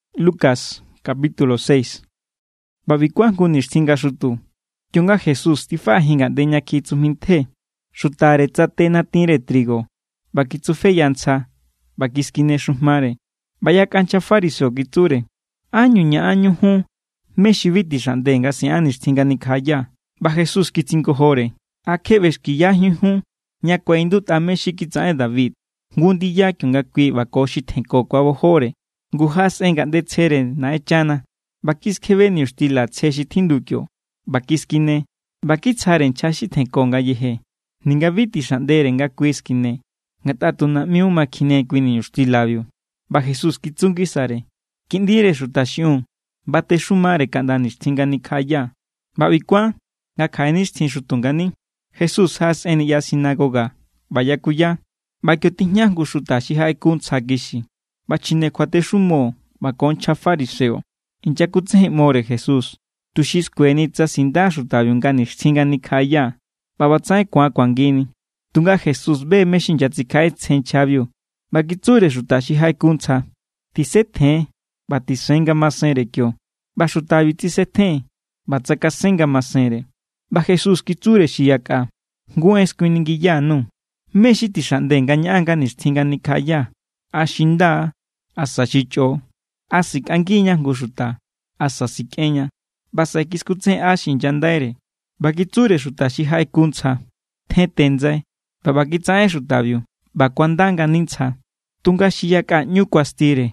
ꞌBa ꞌbi kuán jngu nixtjin nga xutu, kionga Jesús tifaꞌajin ngaꞌnde ña kjiꞌi tsujmi ntje, xutare tsate natinre trigo ꞌba kitsufeya ntsja ꞌba kiskine xujmare. ꞌBa yakꞌa nchja fariseo kitsure: —¿Ánñu ñaꞌanñu jun mé= xi bi tixaꞌnde nga siꞌan nixtjin nga nikjaꞌaya? ꞌBa Jesús kitsingojore: —¿A kje ꞌbexkiyajíun jun ña kuaꞌindutꞌa mé= xi kitsaꞌen David jngu ndiya kionga kui ꞌba ko xi tjenko kuabojore? Ngu jaꞌasꞌen ngaꞌnde tsjere Naꞌenchana ꞌba kiskjebe niñuxtila tsje xi tjindu kio, ꞌba kiskine, ꞌba kitsjare nchja xi tjenko ngayeje. Ninga bi tixaꞌndere nga kui skine, ngatꞌa tu naꞌmiu ma kjine kui niñuxtilabiu. ꞌBa Jesús kitsu ngisare: —Kiꞌndire Xuta xiꞌiun batexumare kaꞌnda nixtjin nga nikjaꞌaya. ꞌBa ꞌbi kuán nga kjaꞌe nixtjin xutu ngani, Jesús jaꞌasꞌen niꞌya sinagoga ꞌba yakuya. ꞌBa kio tijña jngu xuta xi jaꞌeku ntsja kixi. ꞌBa chjine kjuatexumo ꞌba ko nchja fariseo inyakutsejenꞌmore Jesús, tuxi skueni tsa sinda xutabiu nga nixtjin nga nikjaꞌaya ꞌba ꞌbatsaꞌen ku̱an kuangini. Tunga Jesús be= mé= xi inyatsikjaꞌetsjen nchjabiu, ꞌba kitsure xuta xi jaꞌeku ntsja: —Tisetjen ꞌba tisen ngamasenre kio. ꞌBa xutabiu tsisetjen ꞌba tsakasen ngamasenre. ꞌBa Jesús kitsure xi yakꞌa: —Jngu en skuiningiya_nuu̱, ¿Mé= xi tixaꞌnde nga ñaꞌan nga nixtjin nga nikjaꞌaya, a xi nda= asa xi chꞌo? ¿A sikꞌangiña jngu xuta, asa sikꞌenña? ꞌBa saꞌe kiskutsejenꞌa xi inyandaire, ꞌba kitsure xuta xi jaꞌeku ntsja: —Tjente ndsai. ꞌBa ꞌba kitsaꞌen xutabiu, ꞌba kuanda ngani ntsja. Tunga xi yakꞌa ꞌñu kuastire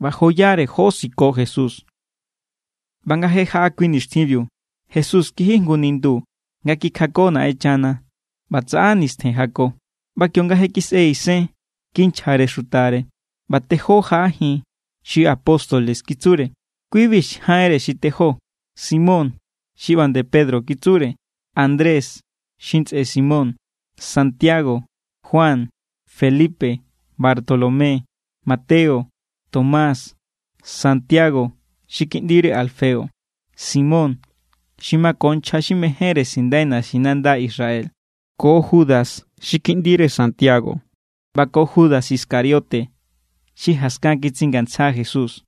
ꞌba joyare jó siko Jesús. ꞌBa nga je jaꞌa kui nixtjinbiu, Jesús kiji jngu nindu nga kikjako Naꞌenchana. ꞌBa tsaꞌa nistjen jako. ꞌBa kionga je kisꞌe isen, kinchjare xutare, ꞌba tejó jaꞌajin xi apóstoles kitsure. Kibi= jaꞌenre xi tejó: Simón xi ꞌba nde Pedro kitsure, Andrés xi ntsꞌe Simón, Santiago, Juan, Felipe, Bartolomé, Mateo, Tomás, Santiago xi kiꞌndire Alfeo, Simón xi mako nchja xi mejénre sindai naxinanda Israel, ko Judas xi kiꞌndire Santiago, ꞌba ko Judas Iscariote xi jaskan kitsingantsja Jesús.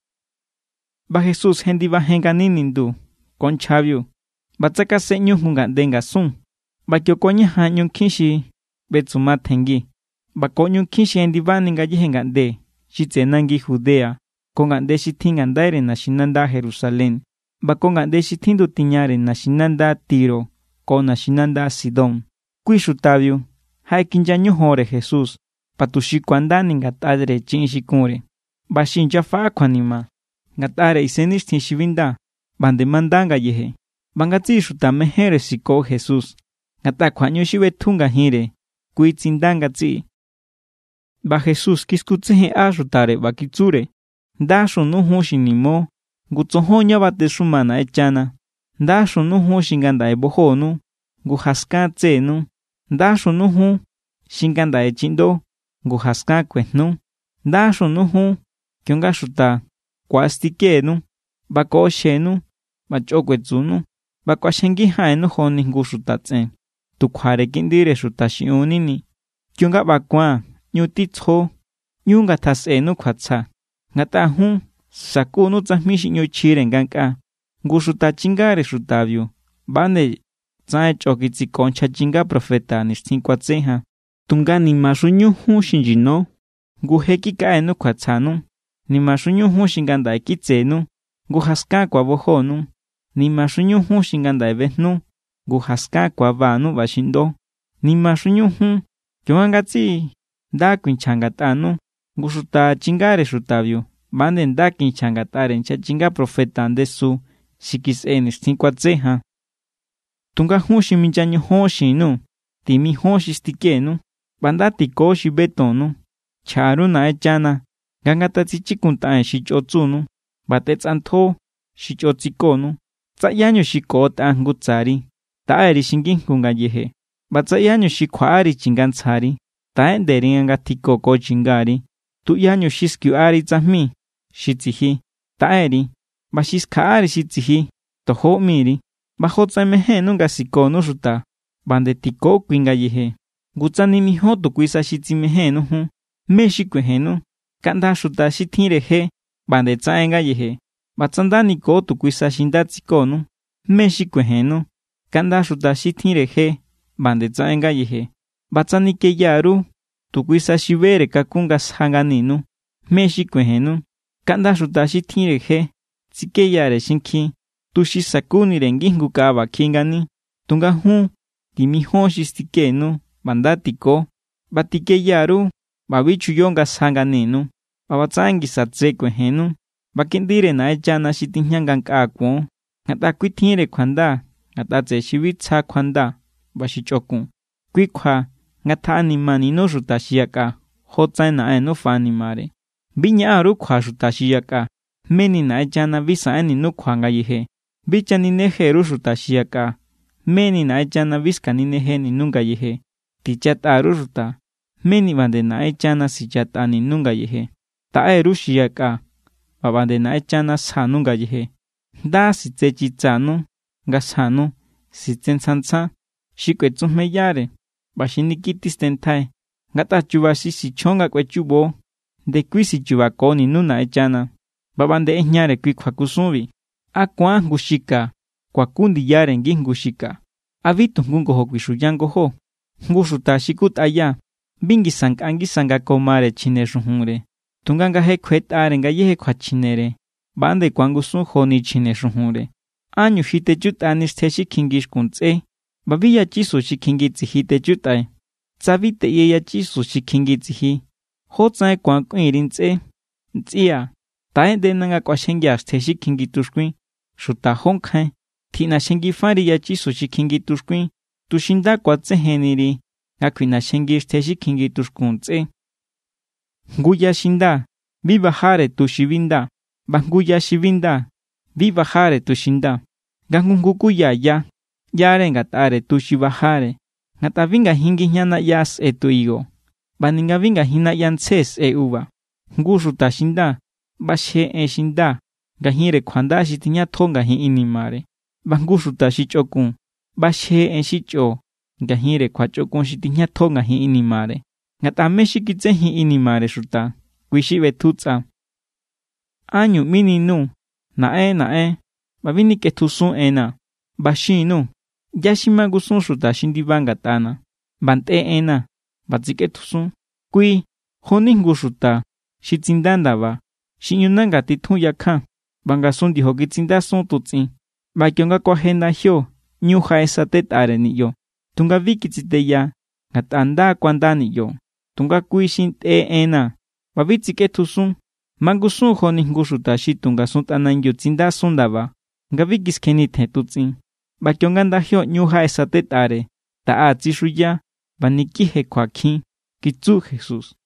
ꞌBa Jesús jendibajen ngani nindu ko nchjabiu, ꞌba tsakasenꞌñu jngu ngaꞌnde ngasun. ꞌBa kio kuañajan ꞌñu nkjin xi ꞌbetsuma tjenngi ꞌba ko ꞌñu nkjin xi jendibani ngayéje ngaꞌnde xi tseꞌe nangi Judea ko ngaꞌnde xi tjin ngandaire naxinanda Jerusalén ꞌba ko ngaꞌnde xi tjindu tiñare naxinanda Tiro ko naxinanda Sidón. Kui xutabiu jaꞌekinya ñojonre Jesús ꞌba tuxi ku̱andani ngatꞌare chiꞌin xi kunre. ꞌBa xi inyafaꞌa kjuanima ngatꞌare isennixtjin xi bi nda, ꞌba nde manda ngayeje. ꞌBa ngatsiꞌi xuta mejénre siko Jesús, ngatꞌa kjuaꞌñu xi ꞌbetju ngajinre kui tsinda ngatsiꞌi. ꞌBa Jesús kiskutsejenꞌa xutare, ꞌba kitsure: —Ndaxunu jun xi nimo, ngu tsojon ña batexuma Naꞌenchana. ’Ndaxunu jun xi ngandaꞌe bojonu, ngu jaskan tsenu. ’Ndaxunu jun xi ngandaꞌe chiꞌndo, ngu jaskan kuejnu. ’Ndaxunu jun kionga xuta ku̱astikenu, ꞌba koꞌoxjenu, ꞌba chꞌo kuetsunu ꞌba kꞌuaxjengi jaꞌenu joni jngu xuta tsꞌen, tu kjuare Kiꞌndire Xuta xiꞌiun= nini. Kionga ꞌba ku̱an, ꞌñu titsjo, ꞌñu ngatjasꞌenu kjuatsja, ngatꞌa jun sakunu tsajmi xi ꞌñu chjire ngankꞌaa. Ngu xuta chingare xutabiu ꞌba nde tsaꞌen chꞌo kitsiko nchja chinga profeta nixtjin kuatse jan. ’Tunga ¡nimaxuñu jun xi nyino, ngu je kikaꞌenu kjuatsjanu! ’¡Nimaxuñu jun xi ngandaꞌe kitsenu, ngu jaskan ku̱abojonu! ’¡Nimaxuñu jun xi ngandaꞌe bejnu, ngu jaskan ku̱abanu ꞌba xiꞌndo! ’¡Nimaxuñu jun kionga ngatsiꞌi nda kuinchja ngatꞌanu, ngu xuta chingare xutabiu ꞌba=nde nda kinchja ngatꞌare nchja chinga profeta ndesu xi kisꞌe nixtjin kuatse jan! ’Tunga jun xi minya ñojon xin_nuu̱: Timijón xi stikenu ꞌba nda tiko xi betonnu. Chjaꞌa_ru Naꞌenchana nga ngatatsichikuntaꞌen xi chꞌo tsunu, ꞌba tꞌetsꞌantjo xi chꞌo tsikonu. Tsa ꞌyáñu xi koꞌotꞌa jngu tsari, taꞌe_ri xi ngijngu ngayeje. ꞌBa tsa ꞌyáñu xi kjuaꞌari chingantsjari, taꞌeꞌnde_ri nga ngatjiko ko chingari. Tuꞌyañu xi skuiꞌari tsajmi xi tsiji, taꞌe_ri. ꞌBa xi skjaꞌari xi tsiji, tojo ꞌmi_ri. ꞌBa jotsaꞌen mejénnu nga sikonu xuta, ꞌba nde tiko kui ngayeje. ’Ngu tsa nimijíon tu kui sa xi tsimejénnu jun, ¿mé= xi kuejennu? Kaꞌnda xuta xi tjinre je ꞌba nde tsaꞌen ngayeje. ꞌBa tsa nda niko tu kui sa xi nda tsikonu, ¿mé= xi kuejennu? Kaꞌnda xuta xi tjinre je ꞌba nde tsaꞌen ngayeje. ꞌBa tsa nikeya_ru tu kui sa xi bere kakun nga sja nganinu, ¿mé= xi kuejennu? Kaꞌnda xuta xi tjinre je tsikeyare xinkjin, tuxi sa̱kunire ngijngu kaꞌa ꞌba kjiꞌi ngani. Tunga jun, timijon xi stikenu ꞌba nda tiko, ꞌba tikeya_ru ꞌba bi chuyo nga sja nganinu. ꞌBa ꞌbatsaꞌen ngisa tse kuejennu, ꞌba kiꞌndire Naꞌenchana xi tijña ngankꞌaa kuon. Ngatꞌa kui tjinre kjuanda ngatꞌa tseꞌe xi bi tsja kjuanda ꞌba xi chꞌokun. Kui kjua ngatjaꞌanimaninu xuta xi yakꞌa, jotsaꞌen Naꞌennu faꞌanimare. ’Bi ñaꞌan_ru kjua xuta xi yakꞌa, meni Naꞌenchana bi saꞌenninu kjua ngayeje. Bi chanineje_ru xuta xi yakꞌa, meni Naꞌenchana bi sikaninejeninu ngayeje. Tichatꞌa_ru xuta, meni ꞌba nde Naꞌenchana sichatꞌaninu ngayeje. Taꞌe_ru xi yaka, ꞌba ꞌba nde Naꞌenchana sjanu ngayeje. Nda sitse chitsanu nga sjanu, sitse tsjan tsjan, xi kꞌuetsujmeyare, ꞌba xi niki tistenntjai. Ngatꞌa chu̱ba̱ xi sichjon nga kꞌuechubo, ndekui sichubakoninu Naꞌenchana. ꞌBa ꞌba nde ꞌejñare kui kjuakusunbi: —¿A ku̱an jngu xi ka kuaku ndiyare ngijngu xi ka? ¿A bi tu jngu ngojo kuixuya ngojó? Jngu xuta xi kutꞌaya bi ngisa nkꞌa ngisa nga ko mare chjine xujunre, tunga nga je kjuetꞌare ngayéje kjuachjinere, ꞌba=nde ku̱angusun joni chjine xujunre. ’¿Ánñu ji techutꞌani xtje xi kjingi xkun ntsꞌé ꞌba bi yachisu xi kjingi tsiji techutꞌai? Tsa bi teꞌye yachisu xi kjingi tsiji, ¿jótsaꞌen ku̱an kꞌuin_ri ntsꞌé: “Ntsꞌia̱, taꞌeꞌndena nga kꞌuaxjengia̱ xtje xi kjingi tuxkuin”? ¡Xuta jó nkjain! Tiꞌnaxjengifari yachisu xi kjingi tuxkuin, tuxi nda ku̱atsejenniri nga kjuiꞌnaxjengi xtje xi kjingi tuxkun ntsꞌé. ’Jngu ya xi nda, bi bajare tu xi bi nda. ꞌBa jngu ya xi bi nda, bi bajare tu xi nda. Nga jngu kuya ya ꞌyare ngatꞌare tu xi bajare. Ngatꞌa bi ngajin ngijña naꞌya sꞌe tu higo, ꞌba ninga ngajin naꞌya ntsje sꞌe uva. Jngu xuta xi nda ꞌbaxje en xi nda ngajinre kjuanda xi tijñatjo ngajin inimare. ꞌBa jngu xuta xi chꞌokun ꞌbaxje en xi chꞌo ngajinre kjuachꞌokun xi tijñatjo ngajin inimare. Ngatꞌa mé= xi kitsejin inimare xuta, kui xi ꞌbetju tsꞌa. ’¿Ánñu ꞌmininuu̱: “Naꞌen, Naꞌen,” ꞌba bi nikꞌetjusun enna̱? ꞌBa xin_nuu̱ ꞌyá= xi mangusun xuta xi ndiba ngatꞌana̱ ꞌba ntꞌe enna̱ ꞌba tsikꞌetjusun. Kui jo=ni jngu xuta xi tsinda ndaba, xi ꞌñu nanga titjun yakjan ꞌba ngasun ndiojo kitsindasun tutsꞌin. ꞌBa kionga kuaje ndajio, ꞌñu jaꞌesatetꞌare niꞌyo. Tunga bi kitsiteya, ngatꞌa nda= kuanda niꞌyo. Tunga kui xi ntꞌe enna̱ ꞌba bi tsikꞌetjusun mangusun= joni jngu xuta xi tu ngasun tꞌanangiu tsindasun ndaba nga bi kiskjennitjen tutsꞌin. ꞌBa kionga ndajio ꞌñu jaꞌesatetꞌare, taꞌa tsixuya ꞌba niki jekjuakjin —kitsu Jesús.